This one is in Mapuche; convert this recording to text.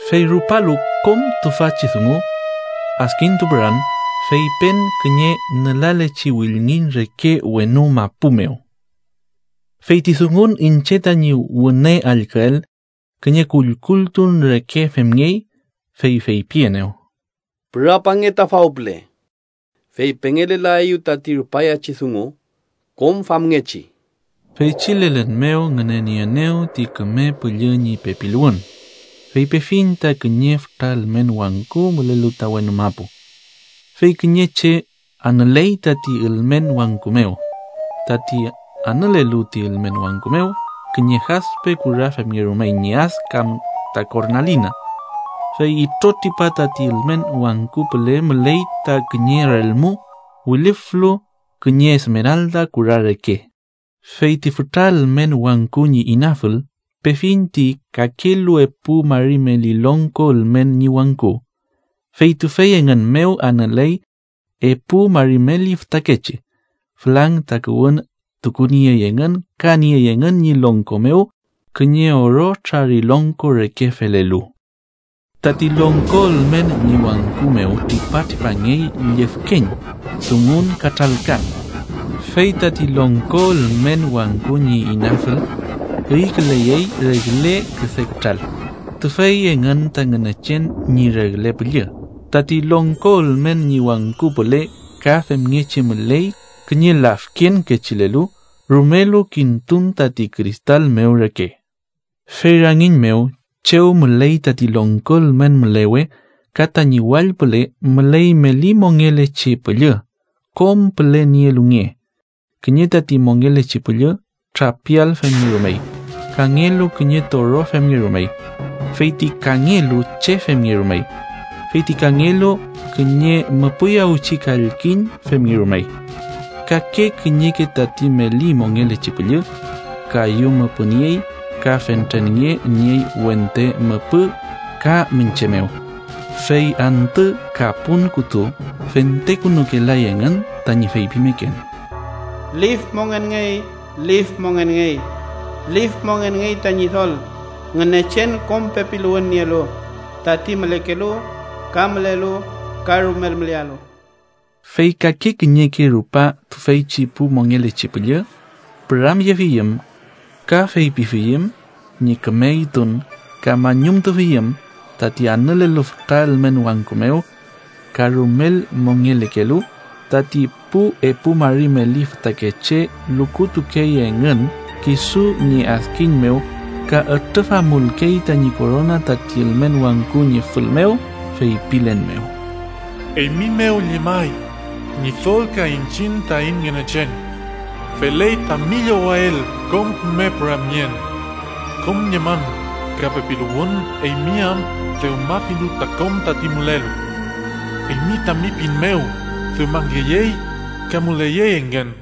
Fey rupalu kom tüfachi dungu, adkintupüran, fey pen kiñe nülalechi wülngiñ reke wenu mapu mew. Fey ti dungun iñche tañi wüne allküel kiñe kullkulltun reke femngey, fey feypienew: “Pürapange ta faw püle, fey pengelelaeyu tati rupayachi dungu kom famngechi.” Feychi lelen mew ngünenieenew ti Küme Püllü ñi pepiluwün, fey pefiñ ta kiñe fütra ülmen wangku mülelu ta wenu mapu, fey kiñe che anüley tati ülmen wangku mew. Tati anülelu ti ülmen wangku mew kiñe jaspe kura femngerumey ñi ad kam ta kornalina, fey itrotripa tati ülmen wangku püle müley ta kiñe relmu wilüflu kiñe esmeralda kura reke. Fey ti fütra ülmen wangku ñi inafül pefiñ ti kakelu epu mari meli longko ülmen ñi wangku, fey tüfey engün mew anüleyey epu mari meli fütakeche: fülang takuwün tukuniey engün ka niey engün ñi longko mew kiñe oro trarilongko reke felelu. Tati longko ülmen ñi wangku mew tripatripangey llüfkeñ, dungun ka tralkan. Fey tati longko ülmen wangku ñi inafül üyküleyey regle küde kütral, tüfey engün ta Ngünechen ñi regle püllü. Tati longko ülmen ñi wangku püle ka femngechi müley kiñe lafken kechilelu, rumelu kintun tati kristal mew reke. Fey rangiñ mew, chew müley tati longko ülmen mülewe, ka tañi wall püle, müley meli mongelechi püllü, kom püle nielu nge. Kiñe tati mongelechi püllü, trapial femngerumey, kangelu kiñe toro femngerumey, fey ti kangelu che femngerumey, fey ti kangelu, kiñe müpüyawchi kalkiñ femngerumey. Kake kiñeke tati meli mongelechi püllü, kayu müpü niey ka fentren nge niey wente müpü ka miñche mew. Fey antü ka pun kütu fentekünukelay engün tañi feypimeken: “Lif mongenngey, Lif mongenngey, Lif mongenngey ta Ñidol, Ngünechen kom pepiluwün nielu, tati mülekelu ka mülelu ka rumel mülealu.” Fey kake kiñeke rupa tüfeychi pu mongelechi püllü püramyefiyüm ka feypifiyüm ñi küme üytun ka mañumtufiyüm tati anülelu fütra ülmen wangku mew ka rumel mongelekelu, tati pu epu mari meli fütakeche lukutukey engün kisu ñi adkiñ mew ka ütrüfamülkey tañi korona tati ülmen wangku ñi fül mew, feypilen mew: “¡Eymi mew llemay, Ñidol ka iñchiñ taiñ Ngünechen, feley tami llowael kom küme püramyen, kom yamün ka pepiluwün eymi am dewmafilu ta kom tati mülelu! ¡Eymi tami pin mew dewmangeyey ka müleyey engün!”